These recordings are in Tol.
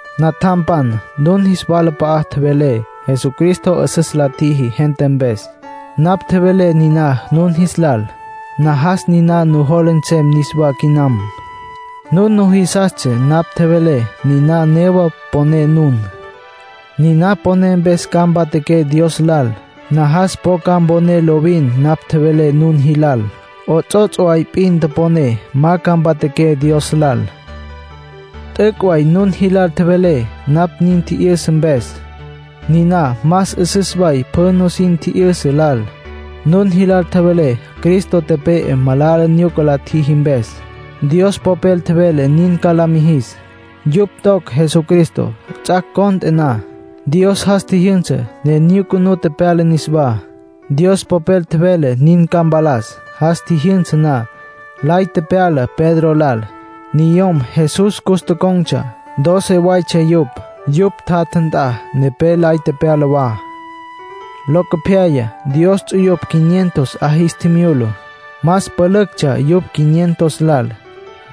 Natjampan, nun jis walap'a'a tjevelé Jesucristo 'üsüs la tjiji gente mpes. Napj tjevelé niná nun jis lal. Najas niná nujola nsem niswá quinam. Nun nujisastsja napj tjevelé. Niná newa poné nun. Niná poné, mpes ca mpatjaqué Dios lal. Najas po ca mponé lovin napj tjevelé nun jilal. 'Ots'ots' way p'in toponé, ma ca mpatjaqué Dios lal. T'üc' way nun jilal tjevelé napj nin tji'yüsa mpes. Niná más 'üsüs way pjü nusin tji'yüsa lal. Nun jilal tjevelé Cristo tepe'e malala nyuca la tjijicj mpes. Dios Popel tjevele nin ca la mijis. Yupj toc Jesucristo. Ts'ac' cont'e na, Dios jas tjijyünsa, ne nyucunú tepyala niswá. Dios Popel tjevele nin ca mpalas. Jas tjijyünsa na, lay tepyala Pedro lal. Niyom Jesús cus tocon̈tsja, doce waytsja yupj; yupj tjatja nt'a, nepé lay tepyala wa. Locopyaya Dios ts'uyupj quinientos 'a jis tjimyula. Más pülüctsja yupj quinientos lal.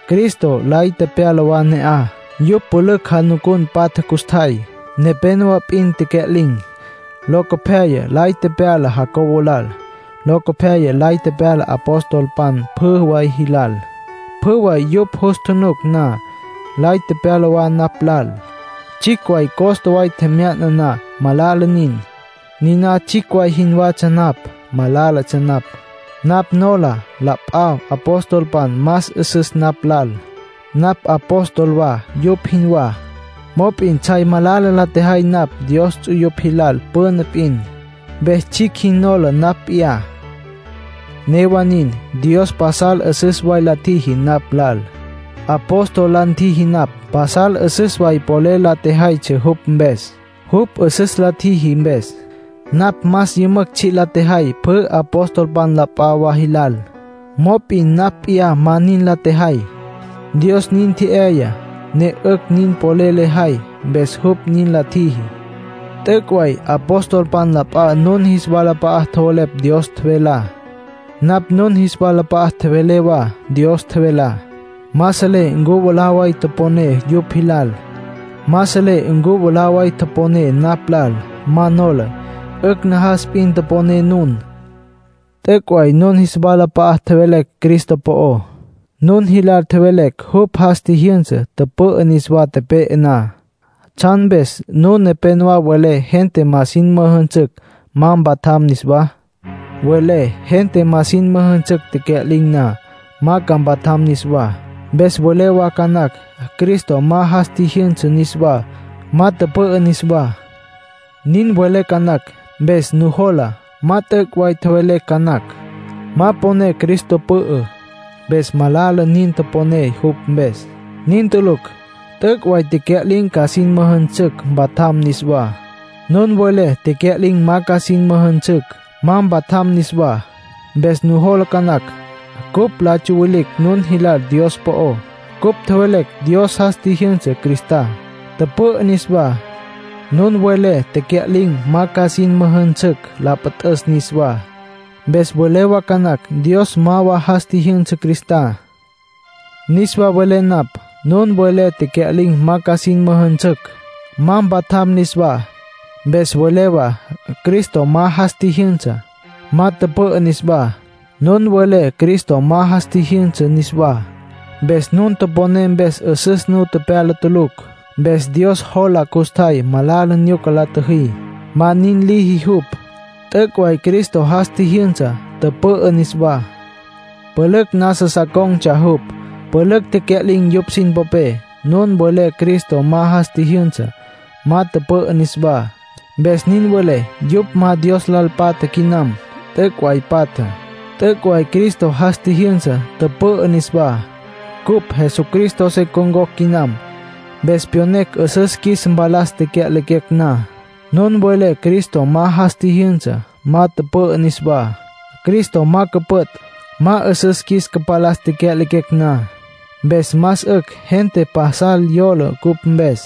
Cristo lay tepyala wa ne'aj. Yupj pülücj janucun patja custjay. Nepénowa p'in tecya'lin̈. Locopyaya lay tepyala Jacobo lal. Locopyaya lay tepyala apostolpan pjü way jilal. Pjü way yupj jus tjunuc na, lay tepyala wa napj lal. Tsjicj costa way tjemya'na na, malala nin. Niná tsjicj way jinwatsja napj. Malálatsja napj. Napj nola la p'a apostolpan más 'üsüs napj lal. Napj apóstol wa, yupj jinwá; mop'in tsjay malala la tjejay napj Dios ts'uyupj jilal püna p'in, mpes tsjicj jin nola napj p'iyá. Newa nin, Dios pasal 'üsüs way la tjiji napj lal. Apóstol la ntjiji napj. Pasal 'üsüs way polel la tjejaytsja jupj mpes, jupj 'üsüs la ntjiji mpes. Napj más yümücj tsji' la tjejay pjü apostolpan la p'a wa jilal. Mop'in napj p'iyá ma nin la tjejay. Dios nin tje'yaya ne 'ücj nin polel lejay. Mpes jupj nin la tjiji. T'üc' way apostolpan la p'a nun jis walap'a'a tjowelepj Dios tjevelá. Napj nun jis walap'a'a tjevelé wa Dios tjevelá. Ma selé ncu mwalá way toponé yupj jilal. Ma selé ncu mwalá way toponé napj lal. Ma nola. 'Ücj najas p'in toponé nun. T'üc' way nun jis walap'a'a tjevelecj Cristo po'ó. Nun jilal tjevelecj jupj jas tjijyünsa, tüpü'ü niswá tepe'e na. ¿Tsjan mpes nun nepénowa welé gente ma sin müjünsücj, ma mpatjam niswá? Welé gente ma sin müjünsücj tecya'lin̈ na, ma mpatjam niswá. Mpes welé wa ca nacj Cristo ma jas tjijyünsa niswá, ma tüpü'ü niswá. Nin welé ca nacj. Mpes nujola ma t'üc' way tjevelecj ca nacj. Ma poné Cristo pü'ü, mpes malala nin toponé jupj mpes. Nin tulucj. T'üc' way tecya'lin̈ ca sin müjünsücj, mpatjam niswá. Nun welé tecya'lin̈ ma ca sin müjünsücj, ma mpatjam niswá. Mpes nujola ca nacj cupj la tsyawilicj nun jilal Dios po'ó; cupj tjevelecj Dios jas tjijyünsa Cristá, tüpü'ü niswá. Nun welé tecya'lin̈ ma ca sin müjünsücj la püt'üs niswá, mpes welé wa ca nacj Dios ma wa jas tjijyünsa Cristá. Niswa velé napj, nun welé tecya'lin̈ ma ca sin müjünsücj, ma mpatjam niswá, mpes welé wa Cristo ma jas tjijyünsa, ma tüpü'ü niswá. Nun welé Cristo ma jas tjijyünsa niswá, mpes nun toponé mpes 'üsüs nu tepyala tulucj. Mpes Dios jola custjay malala nyuca la tjüjí. Ma nin liji jupj. T'üc' way Cristo jas tjijyünsa, tüpü'ü niswá. Pülücj nasa sa con̈tsja jupj. Pülücj tecya'lin̈ yupj sin popé. Nun welé Cristo ma jas tjijyünsa, ma tüpü'ü niswá, mpes nin welé yupj ma Dios lal patja quinam. T'üc' way patja. T'üc' way Cristo jas tjijyünsa, tüpü'ü niswá. Cupj Jesucristo se con̈cocj quinam, mpes pyonecj 'üsüs qjuis mpalas tecya'lequecj na. Nun welé Cristo ma jas tjijyünsa, ma tüpü'ü niswá. Cristo ma cüpüt', ma 'üsüs qjuis cüpalas tecya'lequecj na. Mpes más 'ücj gente pasal yola cupj mpes.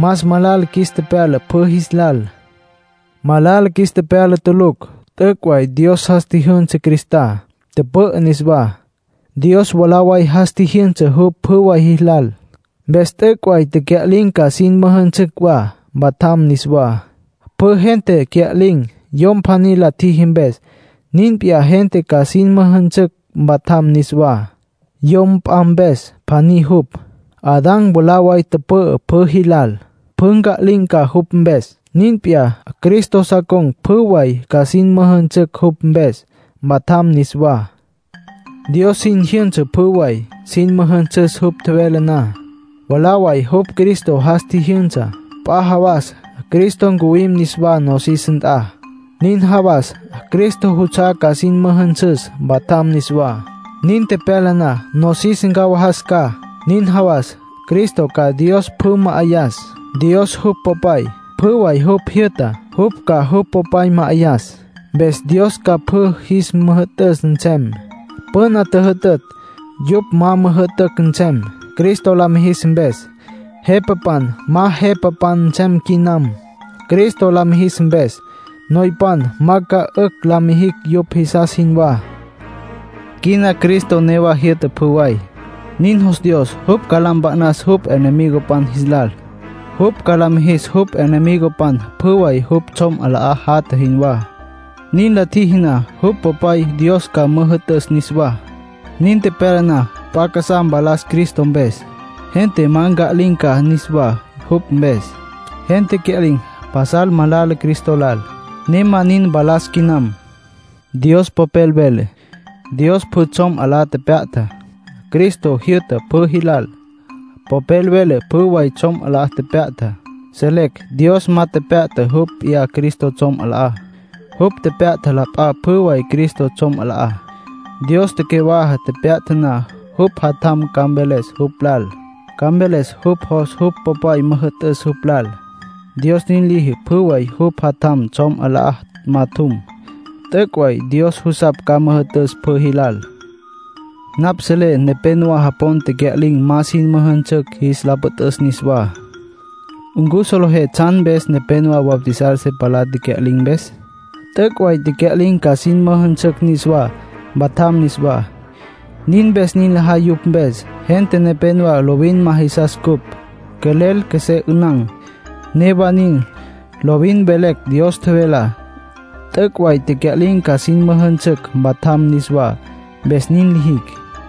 Más malala qjuis tepyala pjü jis lal. Malala qjuis tepyala tulucj. T'üc' way Dios jas tjijyünsa Cristá, tüpü'ü niswá. Dios mwalá way jas tjijyünsa jupj pjü way jis lal. Mpes t'üc' way tecya'lin̈ ca sin müjünsücj wa, mpatjam niswá. Pjü gente cya'lin̈ yom pjaní la tjiji mpes. Nin p'iyá, gente ca sin müjünsücj, mpatjam niswá, yom p'a mpes, pjaní jupj. Adán mwalá way tüpü'ü pjü jilal. Pjü nca'lin̈ ca jupj mpes. Nin p'iyá, Cristo sa con̈ pjü way ca sin müjünsücj jupj mpes, mpatjam niswá. Dios sin jyünsa pjü way. Sin müjünsüs jupj tjevele na. Mwalá way jupj Cristo jas tjijyünsa. P'a jawas Cristo ncuwim niswá nosis nt'a. Nin jawas Cristo juts'a'á ca sin müjünsüs, mpatjam niswá. Nin tepyala na nosis ncawajas ca. Nin jawas, Cristo ca Dios pjü ma'ayas, Dios jupj Popay. Pjü way jupj jyü'ta, jupj ca jupj Popay ma'ayas, mpes Dios ca pjü jis müjü'tüs nsem. Püna tjüjütütj, yupj ma müjü'tücj nsem, Cristo la mijis mpes. Jepapan, ma jepapan nsem quinam, Cristo la mijis mpes. Noypan ma ca 'ücj la mijicj yupj jisas jinwá. Quina Cristo newa jyü'ta pjü way; nin jos Dios. Jupj ca la mpa'nas jupj enemigopan jis lal. Jupj ca la mijis jupj enemigopan pjü way jupj tsjom 'alá jatja jinwá. Nin la tjiji na, jupj Popay Dios ca müjü'tüs niswá. Nin tepyala na, p'a casá mpalas Cristo mpes. Gente ma nca'lin̈ ca niswá jupj mpes. Gente cya'lin̈ pasal malala Cristo lal, ne ma nin mpalas quinam. Dios Popel vele: “Dios pjü tsjom 'alá tepya'ta. Cristo jyü'ta pjü jilal.” Popel vele pjü way tsjom 'alá tepya'ta. Selecj Dios ma tepya'ta jupj p'iyá Cristo tsjom 'alá. Jupj tepya'ta la p'a pjü way Cristo tsjom 'alá. Dios tecyawaja tepya'ta na, jupj Jatjam ca mveles jupj lal, ca mveles jupj jos jupj Popay müjü'tüs jupj lal. Dios nin liji pjü way jupj Jatjam tsjom 'alá majatjum. T'üc' way Dios jusapj ca müjü'tüs pjü jilal. Napj selé nepénowa japon tecya'lin̈ ma sin müjünsücj jis la püt'üs niswá. ¿Ncu solejé tsjan mpes nepénowa bautizar se palá tecya'lin̈ mpes? T'üc' way tecya'lin̈ ca sin müjünsücj niswá, mpatjam niswá; nin mpes nin lajay yupj mpes. Gente nepénowa lovin ma jisas ncupj, quelel qjuesé 'ünan. Newa nin, lovin velecj Dios tjevelá. T'üc' way tecya'lin̈ ca sin müjünsücj, mpatjam niswá; mpes nin lijicj.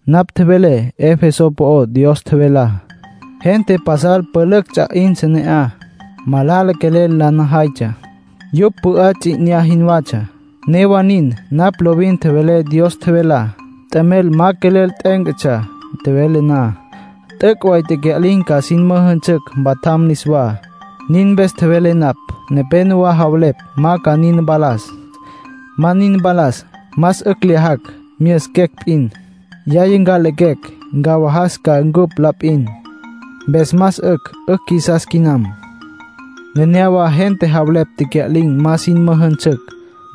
Napj tjevelé Efeso po'ó Dios tjevelá. Gente pasal pülücj ts'a 'intsja ne'aj, malala quelel la najaytsja. Yupj pü'á ts'i 'inyá jinwatsja. Newa nin, napj lovin tjevelé Dios tjevelá. T'emel ma quelel t'e'etsja tjevelé na. T'üc' way tecya'lin̈ ca sin müjünsücj, mpatjam niswá; nin mpes tjevelé napj. Nepénowa javelepj ma ca nin mpalas. Ma nin mpalas, “más 'ücj lyajacj, myüsiquecj p'in. Yaya nca'lequecj, ncawajas ca cupj la p'in, mpes más 'ücj 'ücj qjuisas quinam.” Nenéyawa gente javelepj tecya'lin̈ ma sin müjünsücj.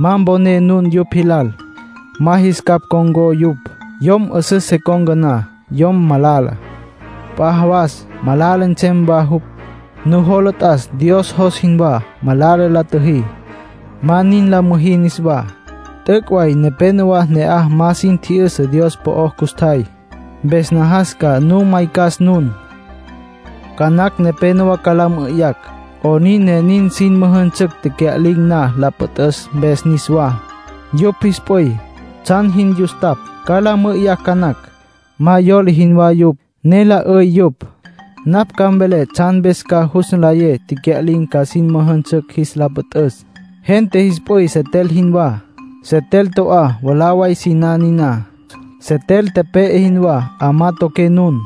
Ma mponé nun yupj jilal. Ma jis capj ncon̈có yupj. Yom 'üsüs se con̈ca na yom malala, p'a jawas malala nsem wa jupj. Nujola t'as Dios jos jinwá. Malala la tjüjí. Ma nin la müjí niswá. T'üc' way nepénowa ne'aj ma sin tji'yüsa Dios po'ó custjay. Mpes najas ca nu maycas nun. Ca nacj nepénowa ca la mü'üyacj: “¿'Onin ne nin sin müjünsücj tecya'lin̈ na la püt'üs mpes niswá? Yupj jis p'üy, ¿tsjan jin yustapj?” ca la mü'üyacj ca nacj. Ma yola jinwá yupj, ne la 'üy yupj. Napj ca mvelé tsjan mpes ca jus nlayé tecya'lin̈ ca sin müjünsücj jis la püt'üs. Gente jis p'üy setel jinwá. Setel to'á, mwalá way siná niná. Setel tepe'e jinwá, 'amá toqué nun.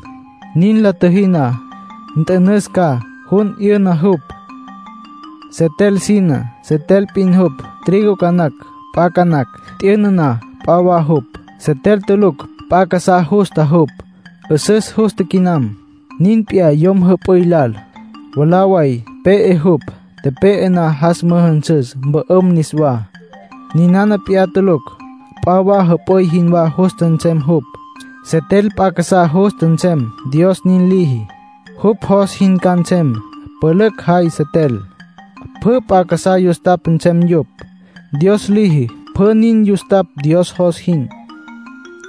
Nin la tjüjí na, nt'ünüs ca, jun 'yüna jupj. Setel siná setel p'in jupj, trigo ca nacj, p'a ca nacj. T'yüna na, p'a wa jupj. Setel tulucj, p'a casá justa jupj. 'Üsüs justa quinam. Nin p'iyá yom jüp'üy lal. Mwalá way pe'e jupj. Tepe'e na, jas müjünsüs, mpü'üm niswá. Ninana p'iyá tulucj, p'a wa jüp'üy jinwá justa nsem jupj. Setel p'a casá justa nsem, Dios nin liji. Jupj jos jin ca nsem. Pülücj jay setel. Pjü p'a casá yustapj nsem yupj, Dios liji. Pjü nin yustapj Dios jos jin.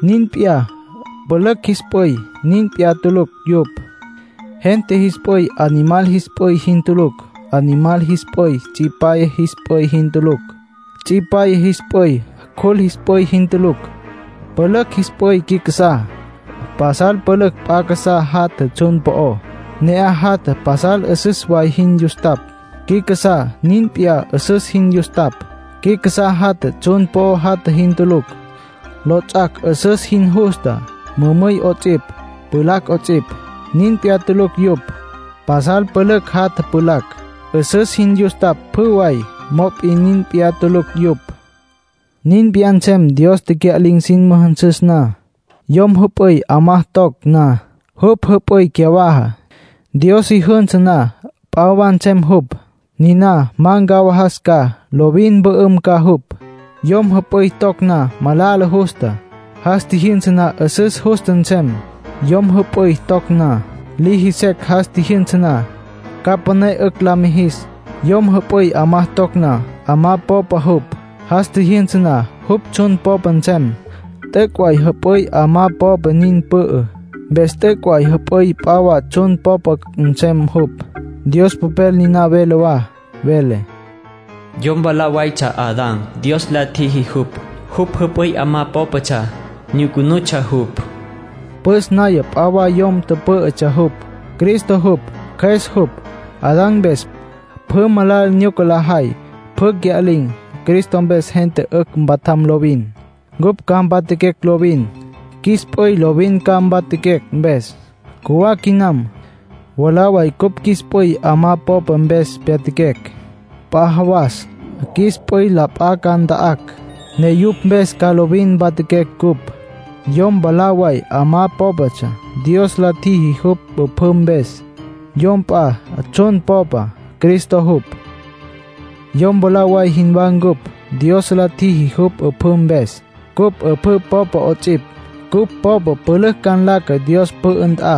Nin p'iyá, pülücj jis p'üy. Nin p'iyá tulucj yupj. Gente jis p'üy animal jis p'üy jin tulucj. Animal jis p'üy tsipyaya jis p'üy jin tulucj. Tsipyaya jis p'üy cjul jis p'üy jin tulucj. Pülücj jis p'üy qui casá. Pasal pülücj p'a casá jatja tsjun po'ó. Ne'aj jatja pasal 'üsüs way jin yustapj. Qui casá nin p'iyá 'üsüs jin yustapj. Qui casá jatja, tsjun po'o jatja jin tulucj. Lots'ac' 'üsüs jin justa, mümüy 'ots'ipj, pjulacj 'ots'ipj. Nin p'iyá tulucj yupj. Pasal pülücj jatja pjulacj. 'Üsüs jin yustapj, pjü way. Mop'in nin p'iyá tulucj yupj. Nin p'iyá nsem Dios tecya'lin̈ sin müjünsüs na. Yom jüp'üy 'amá toc na, jupj jüp'üy cyawaja. Dios si jünsa na, p'a wa nsem jupj. Niná ma ncawajas ca, lovin mpü'üm ca jupj. Yom jüp'üy toc na, malala justa. Jas tjijyünsa na, 'üsüs justa nsem. Yom jüp'üy toc na, liji secj. Jas tjijyünsa na, ca püné 'ücj la mijis. Yom jüp'üy 'amá toc na, 'amá popa jupj. Jas tjijyünsa na, jupj tsjun popa nsem. T'üc' way jüp'üy 'amá popa nin pü'ü. Mpes t'üc' way jüp'üy p'a wa tsjun popa nsem jupj. Dios Popel niná vele wa. Vele: “Yom mwalá waytsja Adán, Dios la tjiji jupj. Jupj jüp'üy 'amá pópatsja, nyucunutsja jupj.” Püs naya p'a wa yom pǘ'ütsja jupj. Cristo jupj. Cjües jupj. Adán mpes, pjü malala nyuca lajay, pjü cya'lin̈. Cristo mpes, gente 'ücj mpatjam lovin. Cupj ca mpatjaquecj lovin. Qjuis p'üy lovin ca mpatjaquecj mpes, cjuwá quinam. Mwalá way cupj qjuis p'üy 'amá popa mpes pyatjaquecj. P'a jawas qjuis p'üy la p'a ca nta'acj, ne yupj mpes ca lovin mpatjaquecj cupj. Yom mwalá way 'amá pópatsja. Dios la tjiji jupj 'üpjǘ mpes. Yom p'a tsjun popa, Cristo jupj. Yom mwalá way jinwá ncupj, Dios la tjiji jupj 'üpjǘ mpes. Cupj 'üpjǘ popa 'ots'ipj. Cupj popa pülücj ca nlaca Dios pü'ü nt'a.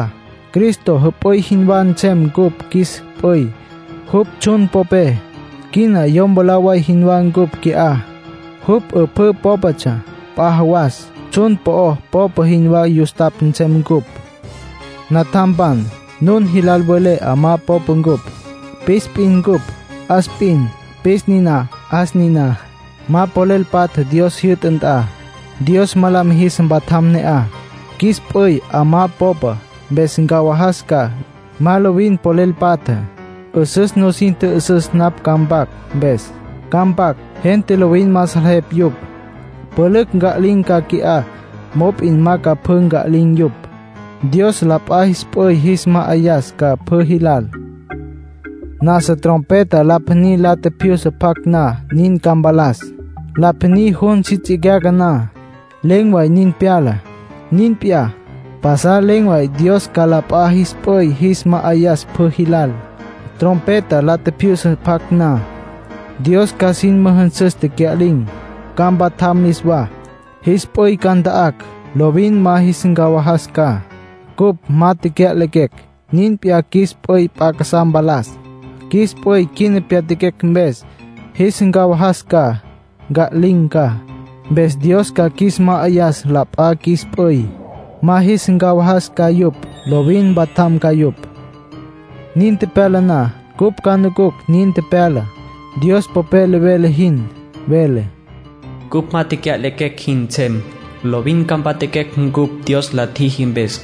Cristo jüp'üy jinwá nsem cupj qjuis p'üy, jupj tsjun popé. Quina yom mwalá way jinwá ncupj qui'á, jupj 'üpjǘ pópatsja. P'a jawas tsjun po'o popa jinwá custapj nsem cupj. Natjampan, nun jilal velé 'amá popa ncupj. Pis p'in cupj, 'as p'in. Pis niná, 'as niná, ma polel patja Dios jyü'ta nt'a. Dios ma la mijis mpatjam ne'aj. Qjuis p'üy 'amá popa, mpes ncawajas ca. Ma lovin polel patja. 'Üsüs nusin tjü'üsüs napj ca mpac mpes. Ca mpac, gente lovin ma salejeptsja yupj. Pülücj nca'lin̈ ca qui'á mop'in ma ca pjü nca'lin̈ yupj. Dios la p'a jis p'üy jis ma'ayas ca pjü jilal. Nasa trompeta la pjaní la tjipjyusa pjac na, nin ca mpalas. La pjaní jun si tsicyaca na, len̈ way nin pyala. Nin p'iyá, pasal len̈ way Dios ca la p'a jis p'üy jis ma'ayas pjü jilal. Trompeta la tjipjyusa pjac na, Dios ca sin müjünsüs tecya'lin̈, ca mpatjam niswá. Jis p'üy ca nta'acj, lovin ma jis ncawajas ca. Cupj ma tecya'lequecj, nin p'iyá, qjuis p'üy p'a casá mpalas. Qjuis p'üy quina pyatjaquecj mpes, jis ncawajas ca. Nca'lin̈ ca. Mpes Dios ca qjuis ma'ayas la p'a qjuis p'üy. Ma jis ncawajas ca yupj. Lovin mpatjam ca yupj. Nin tepyala na, cupj ca nucucj nin tepyala Dios Popel vele jin. Vele: “Cupj ma tecya'lequecj jin nsem. Lovin ca mpatjaquecj ncupj Dios la tjiji mpes.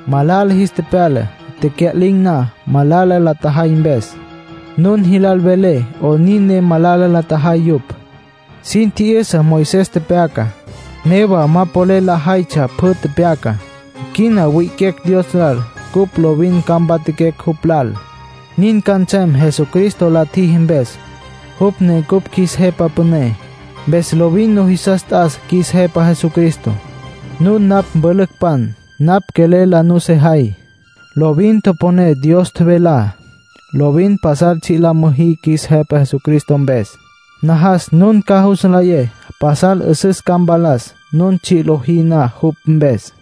Malala jis tepyala tecya'lin̈ na, malala la tjajay mpes. Nun jilal velé 'onin ne malala la tjajay yupj. Sin tji'yüsa Moisés tepyacá, newa ma polel lajaytsja pjü tepyacá. Quina wi'iquecj Dios lal cupj lovin ca mpatjaquecj jupj lal. Nin ca nsem Jesucristo la tjiji mpes, jupj ne cupj qjuis Jepa Püné. Mpes lovin nujisas t'as qjuis Jepa Jesucristo. Nun napj mpülücpan, napj quelel la nusejay. Lovin toponé Dios tjevelá. Lovin pajal tsji' la müjí qjuis Jepa Jesucristo mpes. Najas nun ca jus nlayé pasal 'üsüs ca mpalas, nun tsji' lojí na jupj mpes.